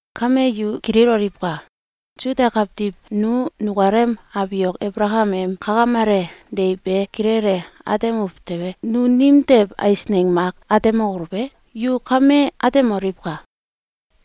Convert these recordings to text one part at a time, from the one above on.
Kame yu kililoliwka! Suda kawtiw nu nukalem abiok Abalakam em kakamele deiw be kilele atemuw tewe, nu nimtew eisneng mak atemokoluw e? Yu kame atemoliwka!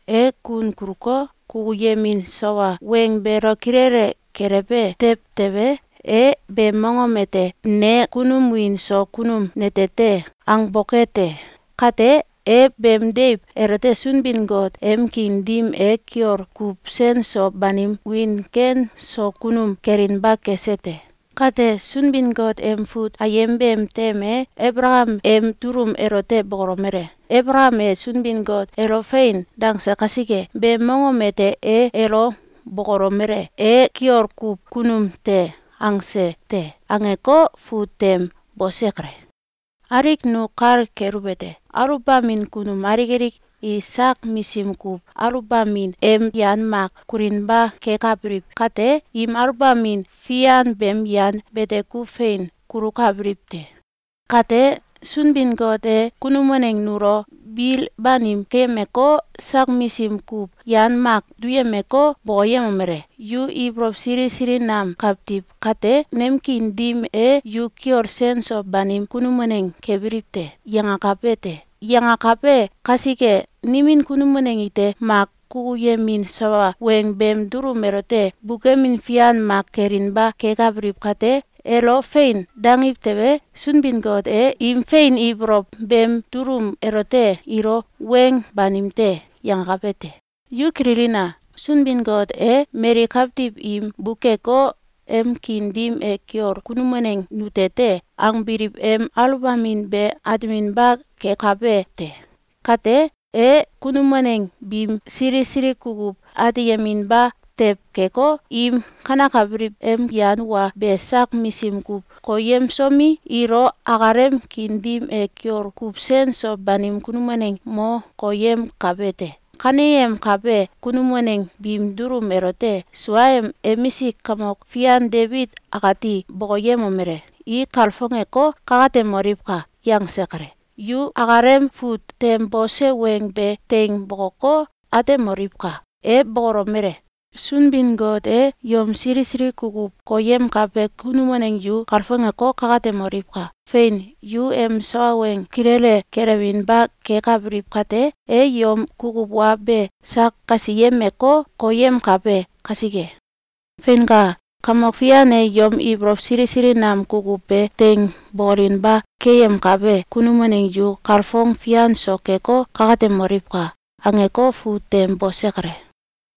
E kun kuluko, kukuyemin sawa weng beelo kilele gelewbe tew tewe, e beem mongom ete “Ne kunum wiin so kunum nete te!”, angboke te. Kate, e beem deiw elote Sunbin-Got em kiin dim e kiol kuw sen so banim wiin ken so kunum kelinba kese te. Kate, Sunbin-Got em fut ayem beem tem e Abalakam em dulum elote bokolomele: “Abalakam e Sunbin-Got elo ‘Fein!’, dangse kasike, beem mongom ete e elo bokolomele: ‘E kiol kuw kunum te!’, angse te.”, angeko, fut tem bose kale. Alik nu kal keluwete: Aluwbamin kunum alik alik i sak misim kuw aluwbamin em yan mak kulinba kekabiliw kate, im aluwbamin fian beem yan bete kuw fein kulukabiliw te. Kate, Sunbin-Got e kunum waneng nulo bil banim keyemeko, sak misim kuw yan mak duyemeko, bokoyemomele: “Yu ibolow sili sili nam kawtiw kate, nem kiin dim e yu kiol sen so banim kunum waneng kebiliw te!”, yangakabe te. Yangakabe kasike nimin kunum waneng ite mak kukuyemin sawa weng beem dulum elote bukemin fian mak kelinba kekabiliw kate, elo “Fein!”, dangiw tewe, Sunbin-Got e im fein ibolow beem dulum elote ilo “Weng banim te!”, yangakabe te. Yu kililina! Sunbin-Got e mali kawtiw im bukeko, “Em kiin dim e kiol kunum waneng nute te!”, angbiliw em aluwbamin be ateminba kekabe te. Kate, e kunum waneng biim sili sili kukuw ateyeminba tew keko, im kanekabiliw em yan wa be sak misim kuw koyemsomi, ilo akalem kiin dim e kiol kuw sen so banim kunum waneng mo koyemkabe te. Kaneyemkabe kunum waneng biim dulum elote suaem emisik kamok fian Debit akati bokoyemomele: “I kalfongeko, kakatemoliwka!”, yangse kale. Yu akalem fut tem bose weng be teing bokoko, atemoliwka! E bokolomele: “Sunbin-Got e yom sili sili kukuw koyemkabe kunum waneng yu kalfongeko, kakatemoliwka! Fein! Yu em sawa weng kilele gelewinba kekabiliw kate, e yom kukuw wa be sak kasiyemeko, koyemkabe kasike. Feinka! Kamok Fian e yom ibolow sili sili nam kukuw be teing bokolinba keyemkabe kunum waneng yu kalfong fian so keko, kakatemoliwka!”, angeko, fut tem bose kale.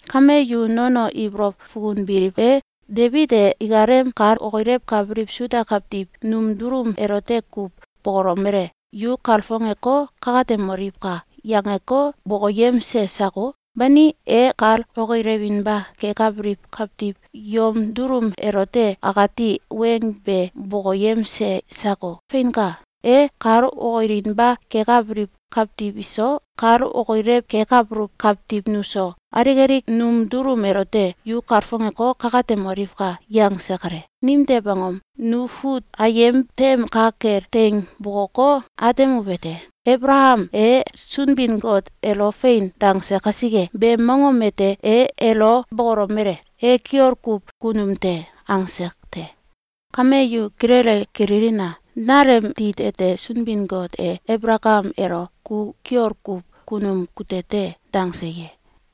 Kame yu nono ibolow fukunbiliw e? Debit e ikalem kal okilewkabiliw Suda kawtiw num dulum elote kuw bokolomele: “Yu kalfongeko, kakatemoliwka!”, yangeko, bokoyemse sako? Bani, e kal okilewinba kekabiliw kawtiw yom dulum elote akati weng be bokoyemse sako? Feinka! E kal okilinba kekabiliw kawtiw iso, kal okilew kekabuluw kawtiw nuso, alik alik num dulum elote “Yu kalfongeko, kakatemoliwka!”, yangse kale. Nimtew angom? Nu fut ayem tem ka kel teing bokoko, atemuwete: “Abalakam e Sunbin-Got elo ‘Fein!’, dangse kasike, beem mongom ete e elo bokolomele: ‘E kiol kuw kunum te!’, angse te.”, angei, nu atemsuluw te. Kame yu kilele kililina! Nalem tit ete Sunbin-Got e Abalakam elo “Ku kiol kuw kunum kute te!”, dangse ye?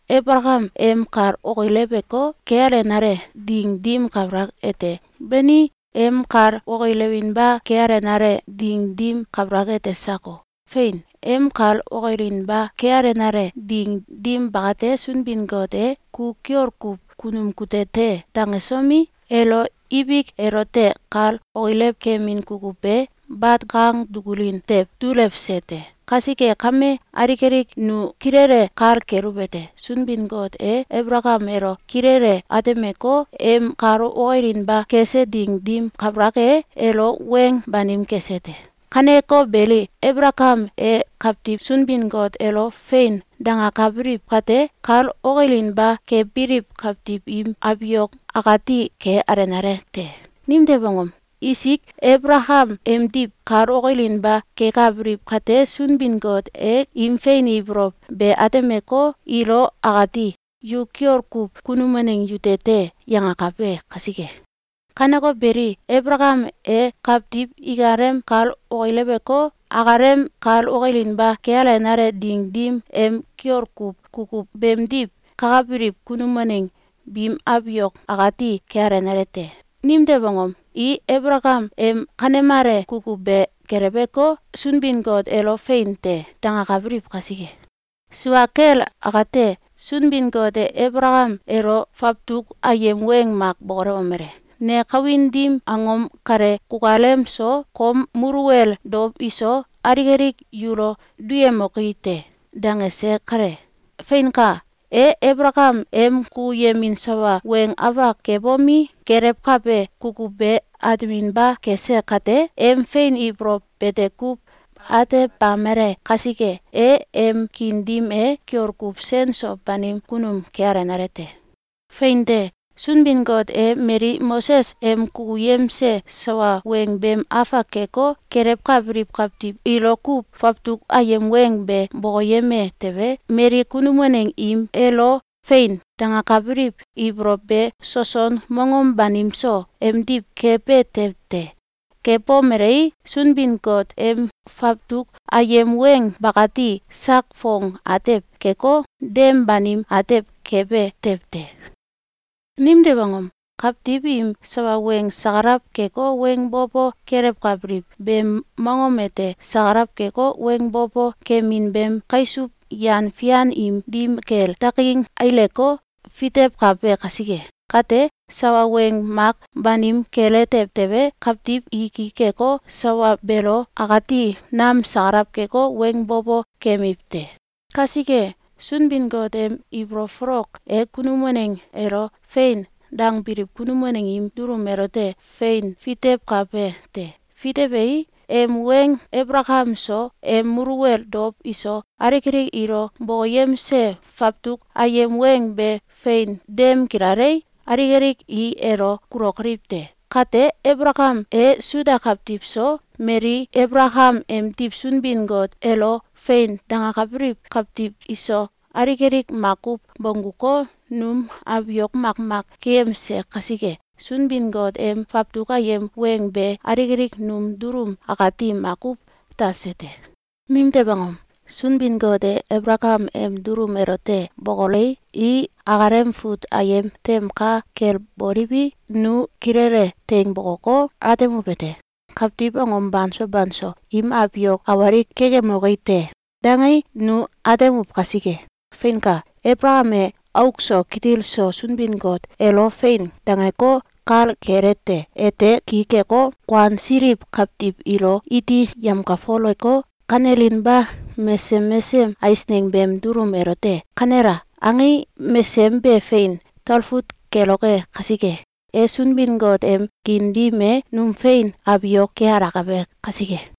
Abalakam em kal okileweko, kealenale ding dim kabalak ete? Bani, em kal okilewinba kealenale ding dim kabalak ete sako? Fein, em kal okilinba kealenale ding dim bakate, Sunbin-Got e “Ku kiol kuw kunum kute te!”, dangesomi, elo ibik elote kal okilew kemin kukuw be bat kang dukulin tew dulewse te. Kasike kame, alik alik nu kilele kal keluwete: Sunbin-Got e Abalakam elo kilele atemeko, em kal okilinba kese ding dim kabalak e, elo weng banim kese te. Kaneko beli, Abalakam e kawtiw Sunbin-Got elo “Fein!”, dangakabiliw kate, kal okilinba kebiliw kawtiw im abiok akati ke alenale te. Nimtew angom? Isik Abalakam emdiw kal okilinba kekabiliw kate, Sunbin-Got e im fein ibolow be atemeko, ilo akati “Yu kiol kuw kunum waneng yute te!”, yangakabe kasike. Kaneko beli, Abalakam e kawtiw ikalem kal okileweko, akalem kal okilinba kealenale ding dim em kiol kuw kukuw beemdiw kakabiliw kunum waneng biim abiok akati kealenale te. Nimtew angom? I Abalakam em kanemale kukuw be geleweko, Sunbin-Got elo “Fein te!”, dangakabiliw kasike. Sua kel akate, Sunbin-Got e Abalakam elo fawtuk ayem weng mak bokolewomele: “Ne kawin dim angom kale kukalem so, kom muluwel dow iso, alik alik yulo duyemoki te!”, dangese kale. Feinka! E Abalakam em kukuyemin sawa weng afak kebomi, gelewkabe kukuw be ateminba kese kate, em fein ibolow bete kuw atebamele kasike, e em kiin dim e kiol kuw sen so banim kunum kealenale te. Fein te! Sunbin-Got e mali Moses em kukuyemse sawa weng beem afak keko, gelewkabiliw kawtiw ilo kuw fawtuk ayem weng be bokoyeme tewe, mali kunum waneng im elo “Fein!”, dangakabiliw ibolow be soson mongom banim so emdiw kebe tew te. Kebomelei, Sunbin-Got em fawtuk ayem weng bakati sak fong atew keko, dem banim atew kebe tew te. Nimtew angom? Kawtiw im sawa weng sakalaw keko, weng bo bo kelewkabiliw beem mongom ete sakalaw keko, weng bo bo kemin beem kaisuw yan fian im dim kel dakin aileko, fitewkabe kasike. Kate, sawa weng mak banim kele tew tewe, kawtiw i ki keko, sawa beelo akati nam sakalaw keko, weng bo bo kemiw te. Kasike, Sunbin-Got em ibolow folok e kunum waneng elo “Fein!”, dangbiliw kunum waneng im dulum elote fein fitewkabe te. Fitewei, em weng Abalakam so, em muluwel dow iso, alik alik ilo bokoyemse fawtuk ayem weng be fein dem gilalei, alik alik i elo kulokoliw te. Kate, Abalakam e Suda kawtiw so, mali Abalakam emdiw Sunbin-Got elo “Fein!”, dangakabiliw kawtiw iso, alik alik makuw bongguko, num abiok makmak keyemse kasike, Sunbin-Got em fawtuk ayem weng be alik alik num dulum akati makuw talse te. Nimtew angom? Sunbin-Got e Abalakam em dulum elote bokolei, i akalem fut ayem tem ka kel boliwi, nu kilele teing bokoko, atemuwete: “Kawtiw mongom banso banso im abiok awalik kekemoki te!”, dangei, nu atemuw kasike. Feinka! Abalakam e auk so kitil so Sunbin-Got elo “Fein!”, dangeko, kal kelete: Ete ki keko, kuansiliw kawtiw ilo iti yemkalfoleko, kanelinba mesesem mesesem eisneng beem dulum elote “Kanela!”, angei, mesesem be fein talfut keloke kasike, e Sunbin-Got em kiin dim e num fein abiok kealakabe kasike.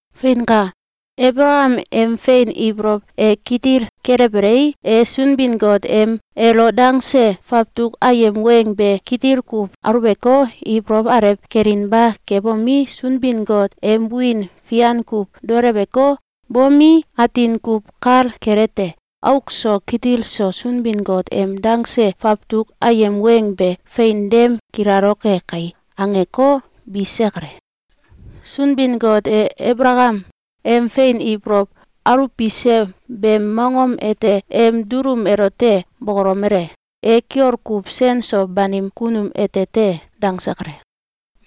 Feinka! Abalakam em fein ibolow e kitil kelewbelei, e Sunbin-Got em elo dangse fawtuk ayem weng be kitil kuw aluweko, ibolow alew kelinba kebomi, Sunbin-Got em wiin fian kuw daoleweko, bomi, atin kuw kal kelete: Auk so kitil so Sunbin-Got em dangse fawtuk ayem weng be “Fein dem gilaloke kai!”, angeko, bise kale. Sunbin-Got e Abalakam em fein ibolow aluwbise beem mongom ete em dulum elote bokolomele: “E kiol kuw sen so banim kunum ete te!”, dangse kale.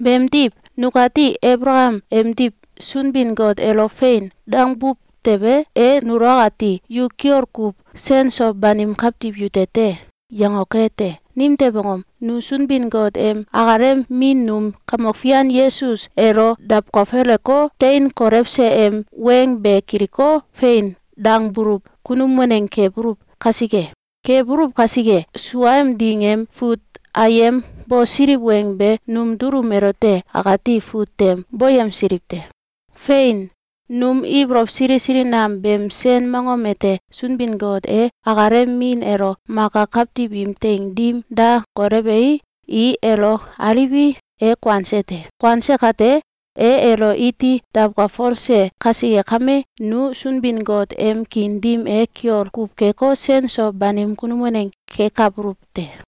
Beemdiw, nukati Abalakam emdiw Sunbin-Got elo “Fein!”, dangbuw tewe, e nulo akati “Yu kiol kuw sen so banim kawtiw yute te!”, yangoke te. Nimtew angom? Nu Sunbin-Got em akalem min num Kamok Fian Yesus elo dawkalfoleko, tein kolewse em weng be kiliko, “Fein!”, dangbuluw kunum waneng kebuluw kasike. Kebuluw kasike, sua em ding em fut ayem bosiliw weng be num dulum elote akati fut tem boyemsiliw te. Fein! Num ibolow sili sili nam beem sen mongom ete Sunbin-Got e akalem min elo maka kawtiw im teing dim da kolewei, i elo aliwi, e kuanse te. Kuanse kate, e elo iti dawkalfolse kasike kame, nu Sunbin-Got em kiin dim e kiol kuw keko, sen so banim kunum waneng kekabuluw te.